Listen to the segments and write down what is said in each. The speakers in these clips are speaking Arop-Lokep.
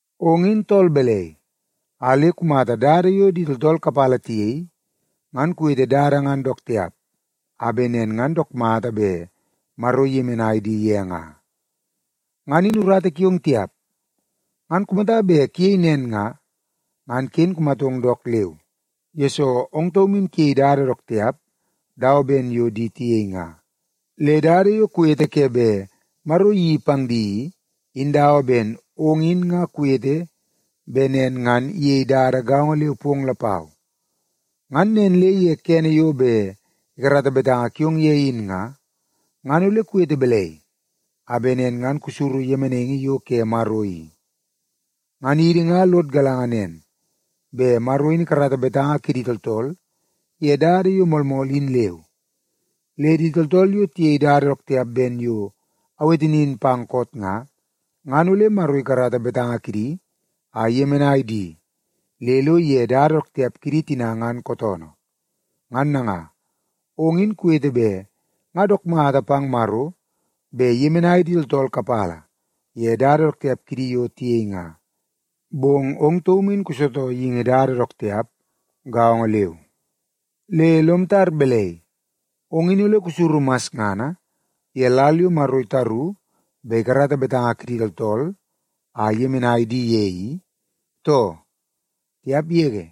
Ong in tool belei a le kumata dada yo di tooltool kapala tiyei, ngan kuwete dada ngan dook tiap a be nen ngan dook mata be Maro iyemenai di ye nga? Ngan in urata kiong tiap! Ngan kumata be kuyei nen nga, ngan kin kumatong dook leu, yesoo ong taum in kuyei dada dook tiap dawa ben yo di tiyei nga. Le dada yo kuwete ke be Maro iyeii pang di i, in dawa ben ong in nga kuwete be nen ngan iyei dada gaongo leu pong lapau. Ngan nen le ye kene yo be ikarata betanga kiong ye in nga, ngan ole kuwete belei a be nen ngan kusuru yemenaingi yo ke Maro i? Ngan idi nga lod galanga nen, be Maro in ikarata betanga kidi tooltool ye dada yo moolmool in leu. Le di tooltool yo tiyei dada dook tiap ben yo awete nin pang koot nga, ngan ole Maro ikarata betanga kidi a iyemenai di le lo iye dada dook tiap kidi tina ngan kootoonoo. Ngan nanga, ong in kuwete be nga dook mata pang Maro be iyemenai di tooltool kapala ye dada dook tiap kidi yo tiyei nga, bong ong taum in kusootoo yeingi dada dook tiap gaongo leu. Le lom tar belei, ong in ole kusuru masngana ye lal yo Maro itaru be ikarata betanga kidi tooltool a iyemenai di ye i, too? Tiap yege!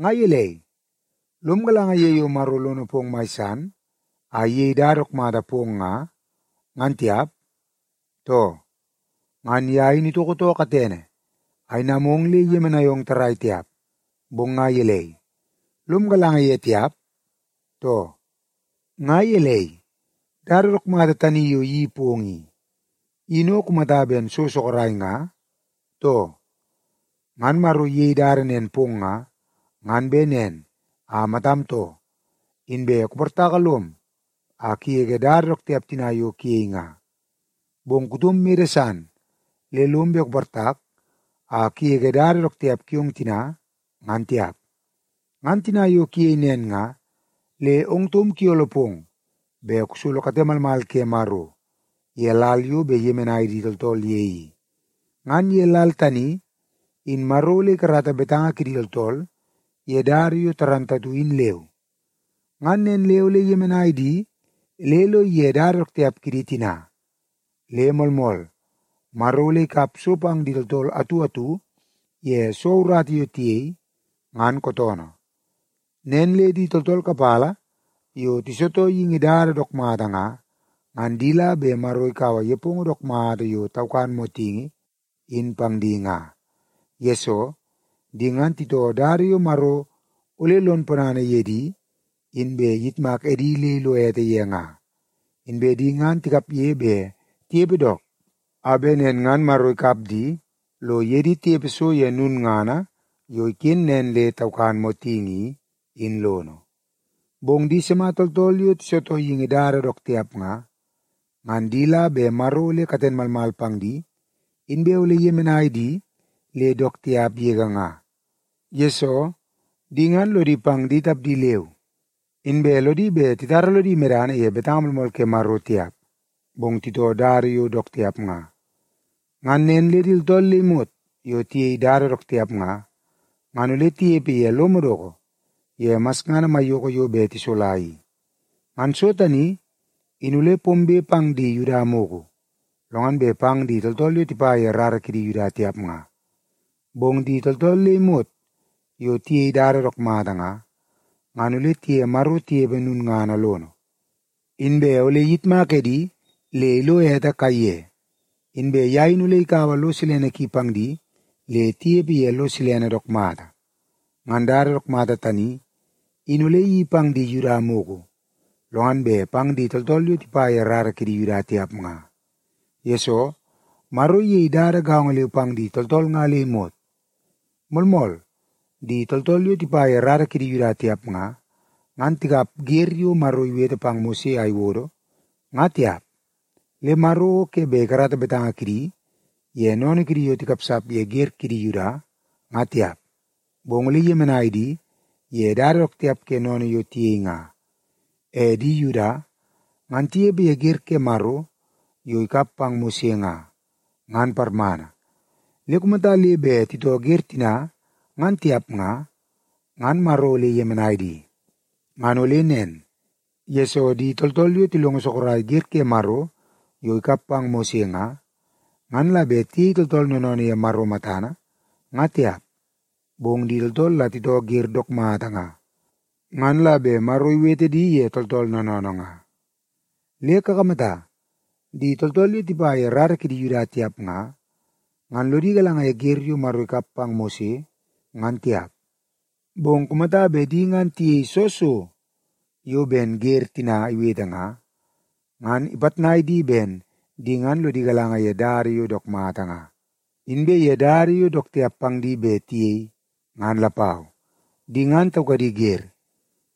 Nga yelei, lom galanga ye yo Maro lono pong mai san a iyei dada dook mata pong nga, ngan tiap, too? Ngan ya in itoko too katene a inamong le iyemenai ong tarai tiap, bong nga yelei, lom galanga ye tiap, too? Nga yelei, dada dook mata tani yo iyeii pong i, in o kumata ben so sokorai nga, too? Ngan Maro iyei dada nen pong nga, ngan be nen a matam too, inbe kuportaka lom a kuyege dada dook tiap tina yo kuyei nga. Bong kutom mede san le lom be kuportak a kuyege dada dook tiap kiong tina, ngan tiap. Ngan tina yo kuyei nen nga, le ong taum kuyolo pong be kusolo kate malmal ke Maro ye lal yo be iyemenai di tooltool ye i. Ngan ye lal tani, in Maro ole ikarata betanga kidi tooltool ye dada yo tarantatu in leu, ngan nen le ole iyemenai di le lo iye dada dook tiap kidi tina. Le moolmool, Maro ole ikap so pang di tooltool atu atu ye soo urata yo tiyei, ngan kootoonoo. Nen le di tooltool kapala yo tisootoo yeingi dada dook mata nga, ngan di la be Maro ikaua yepongo dook mata yo taukan motingi in pang di nga. Yesoo, di ngan titoo dada yo Maro ole lon ponana ye di, inbe iyitmak edi le ilo ete ye nga. Inbe di ngan tikapye be tiyepe dook, a be nen ngan Maro ikap di lo iye di tiyepe so ye nunngana yo iken nen le taukan motingi i, in lono. Bong di sema tooltool yo tisootoo yeingi dada dook tiap nga, ngan di la be Maro ole katen malmal pang di inbe ole iyemenai di le dook tiap yege nga. Yesoo, di ngan lodi pang di tapdi leu, inbe lodi be titara lodi medana ye betanga moolmool ke Maro tiap, bong titoo dada yo dook tiap nga. Ngan nen le di tooltool le imot yo tiyei dada dook tiap nga, ngan ole tiyepe ye lo modoko ye masngana maiyoko yo be tisola i. Ngan so tani in ole pombe pang di Yuda muku, lo ngan be pang di tooltool yo tipa ye rara kidi Yuda tiap nga. Bong di tooltool le imot yo tiyei dada dook mata nga, ngan ole tiye Maro tiyepe nunngana lono. Inbe ole iyitmak edi le ilo ete kaiye, inbe ya in ole ikaua lo silene ki pang di le tiyepe ye lo silene dook mata. Ngan dada dook mata tani, in ole iyeii pang di Yuda muku, lo ngan be pang di tooltool yo tipa ye rara kidi Yuda tiap nga. Yesoo, Maro iyei dada gaongo leu pang di tooltool nga le imot. Moolmool, di tooltool yo tipa ye rara kidi Yuda tiap nga, ngan tikap ger yo Maro iwete pang Mose a iwodo, nga tiap. Le Maro o ke be ikarata betanga kidi ye noonoo kidi yo tikapsap ye ger kidi Yuda, nga tiap, bong ole iyemenai di ye dada dook tiap ke noonoo yo tiyei nga. E di Yuda, ngan tiyepe ye ger ke Maro yo ikap pang Mose nga, ngan parmana, le kumata le be titoo ger tina ngan tiap nga, ngan Maro ole iyemenai di. Ngan ole nen, yesoo di tooltool yo tilongo sokorai ger ke Maro yo ikap pang Mose nga, ngan la be tiyei tooltool noonoonoo ye Maro matana, nga tiap, bong di tooltool la titoo ger dook mata nga, ngan la be Maro iwete di ye tooltool noonoonoo nga. Le kakamata, di tooltool yo tipa ye rara kidi Yuda tiap nga, ngan lodi galanga ye ger yo Maro ikap pang Mose, ngan tiap. Bong kumata be di ngan tiyei soo so yo ben ger tina iwete nga, ngan ipatnai di ben di ngan lodi galanga ye dada yo dook mata nga, inbe ye dada yo dook tiap pang di be tiyei, ngan lapau. Di ngan taukadi ger,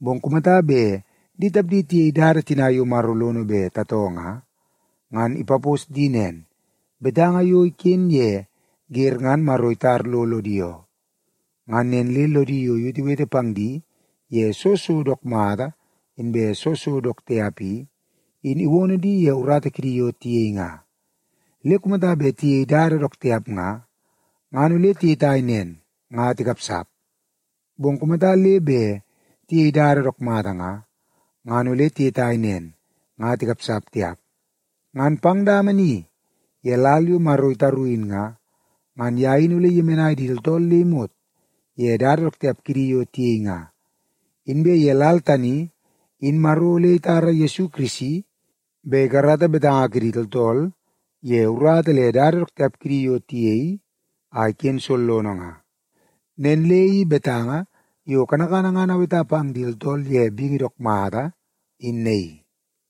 bong kumata be di tapdi tiyei dada tina yo Maro lono be tatoo nga, ngan ipapos di nen; betanga yo iken ye ger ngan Maro itar lo lodi oo. Ngan nen le lodi yo iwetewete pang di ye soo so dook mata inbe soo so dook tiap i, in iwono di ye urata kidi yo tiyei nga. Le kumata be tiyei dada dook tiap nga, ngan ole tiyetai nen nga tikapsap. Bong kumata le be tiyei dada dook mata nga, ngan ole tiyetai nen nga tikapsap tiap. Ngan pang dama ni ye lal yo Maro itaru in nga, ngan ya in ole iyemenai di tooltool le imot ye dada dook tiap kidi yo tiyei nga. Inbe ye lal tani in Maro ole itara Yesu Kirisi be ikarata betanga kidi tooltool ye urata le dada dook tiap kidi yo tiyei a iken sollono nga. Nen le i betanga yo kanakana ngan aweta pang di tooltool ye bingi dook mata, in naii.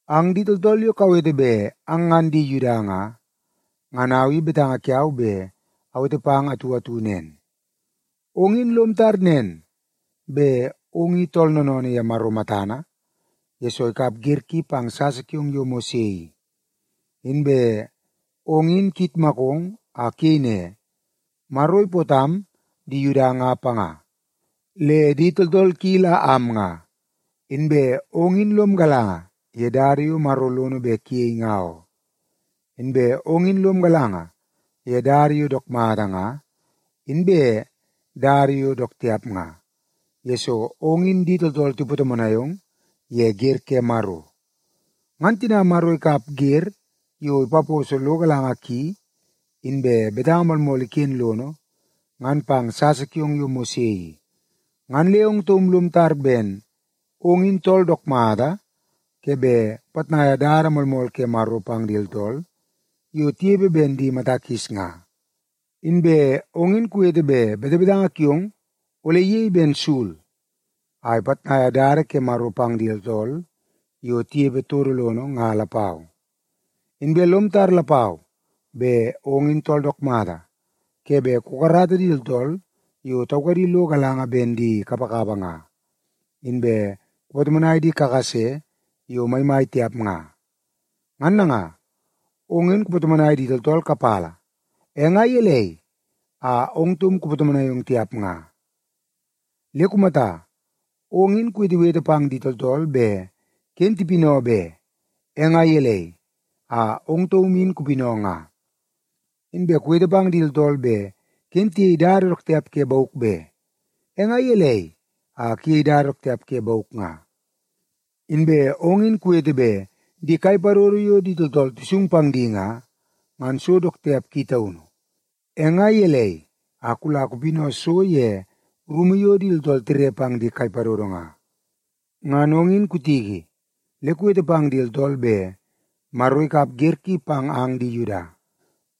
Ang di tooltool yo kawete be ang ngan di Yuda nga, ngan au i betanga kiau be awete pang ang atu atu nen. Ong in lom tar nen be ong i tool noonoonoo ye Maro matana, yesoo ikap ger ki pang sasa kiong yo Mose i. Inbe ong in kuyitmakong a kuyei ne, “Maro ipootam am di Yuda nga panga, le di tooltool ki la am nga.” Inbe ong in lom galanga ye dada yo Maro lono be kuyei nga oo. Inbe ong in lom galanga ye dada yo dook mata nga, inbe dada yo dook tiap nga, yesoo ong in di tooltool tipatomonai ong ye ger ke Maro. Ngan tina Maro ikap ger yo ipaposo lo galanga ki, inbe betanga moolmool iken lono, ngan pang sasa kiong yo Mose i, ngan le ong taum lom tar ben ong in tool dook mata ke be kupatnaia dada moolmool ke Maro pang di tooltool yo tiyepe ben di mata kis nga. Inbe ong in kuwete be betebetanga kiong ole iyei ben sul a ipatnaia dada ke Maro pang di tooltool yo tiyepe todo lono nga lapau. Inbe lom tar lapau be ong in tool dook mata ke be kukarata di tooltool yo taukadi lo galanga ben di kapakapa nga, inbe kupatomonai di kakase yo maimai tiap nga. Ngan nanga, ong in kupatomonai di tooltool kapala, e nga yelei a ong taum kupatomonai ong tiap nga? Le kumata, ong in kuwetewete pang di tooltool be kin tipinoo be, e nga yelei a ong taum in kupinoo nga? Inbe kuwete pang di tooltool be kin tiyei dada dook tiap ke bauk be, e nga yelei a kuyei dada dook tiap ke bauk nga? Inbe ong in kuwete be di kai padodo yo di tooltool tisung pang di nga, ngan so dook tiap ki taunu, e nga yelei a kula kupinoo so ye rumu yo di tooltool tire pang di kai padodo nga? Ngan ong in kutiki le kuwete pang di tooltool be Maro ikap ger ki pang ang di Yuda,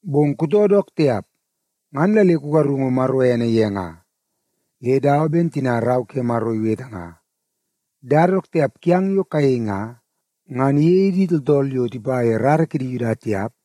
bong kutoo dook tiap, ngan la le kugarungu Maro ene ye nga. Le dawa ben tina Rau ke Maro iwete nga, “Dada dook tiap kiang yo kayei nga, ngan iyei di tooltool yo tipa ye rara kidi Yuda tiap,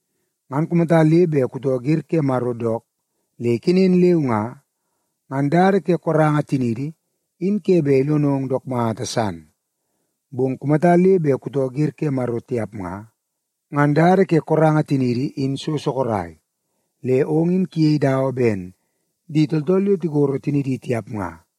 Ngan kumata le be kutoo ger ke Maro dook le ikenen leu nga, ngan dada ke koranga tiniidi in ke be ilonong dook mata san. Bong kumata le be kutoo ger ke Maro tiap nga, ngan dada ke koranga tiniidi in so sokorai, le ong in kuyei dawa ben di tooltool yo tikoro tinidi tiap nga.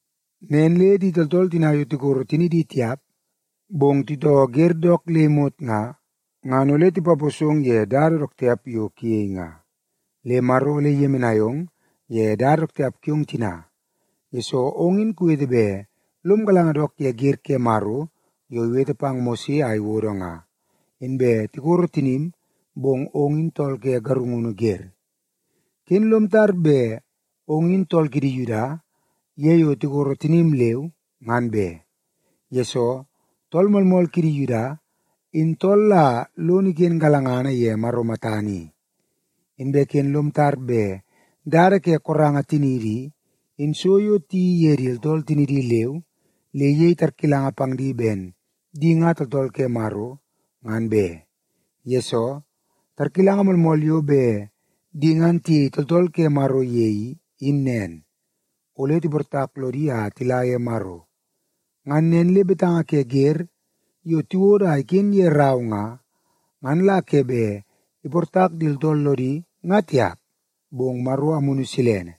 Nen le di tooltool tina yo tikoro tinidi tiap, bong titoo ger dook le imot nga, ngan ole tipaposong ye dada dook tiap yo kuyei nga. Le Maro ole iyemenai ong ye dada dook tiap kiong tina, yesoo ong in kuwete be lom galanga dook ye ger ke Maro yo iwete pang Mose a iwodo nga, inbe tikoro tinim, bong ong in tool ke garungunu ger. Kin lom tar be ong in tool kidi Yuda ye yo tikoro tinim leu, ngan be. Yesoo, tool moolmool kidi Yuda, in tool la lono iken galangana ye Maro matana i. Inbe kin lom tar be dada ke koranga tiniidi i, in so yo tiyeii ye di tooltool tinidi leu le iyei tarkilanga pang di ben di nga tooltool ke Maro, ngan be. Yesoo, tarkilanga moolmool yo be di ngan tiyei tooltool ke Maro ye i, in nen; ole tiportak lodi a tila ye Maro. Ngan nen le betanga ke ger yo tiwodo a iken ye rau nga, ngan la ke be iportak di tooltool lodi nga tiap, bong Maro Amunu Silene,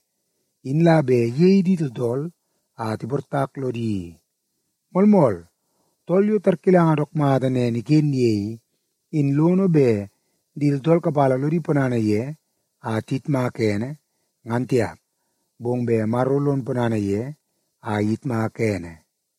in la be iyei di tooltool a tiportak lodi i. Moolmool, tool yo tarkilanga dook mata nen iken ye i, in lono be di tooltool kapala lodi ponana ye a tiyitmak ene, ngan tiap, bong be Maro lon ponana ye a iyitmaka ene.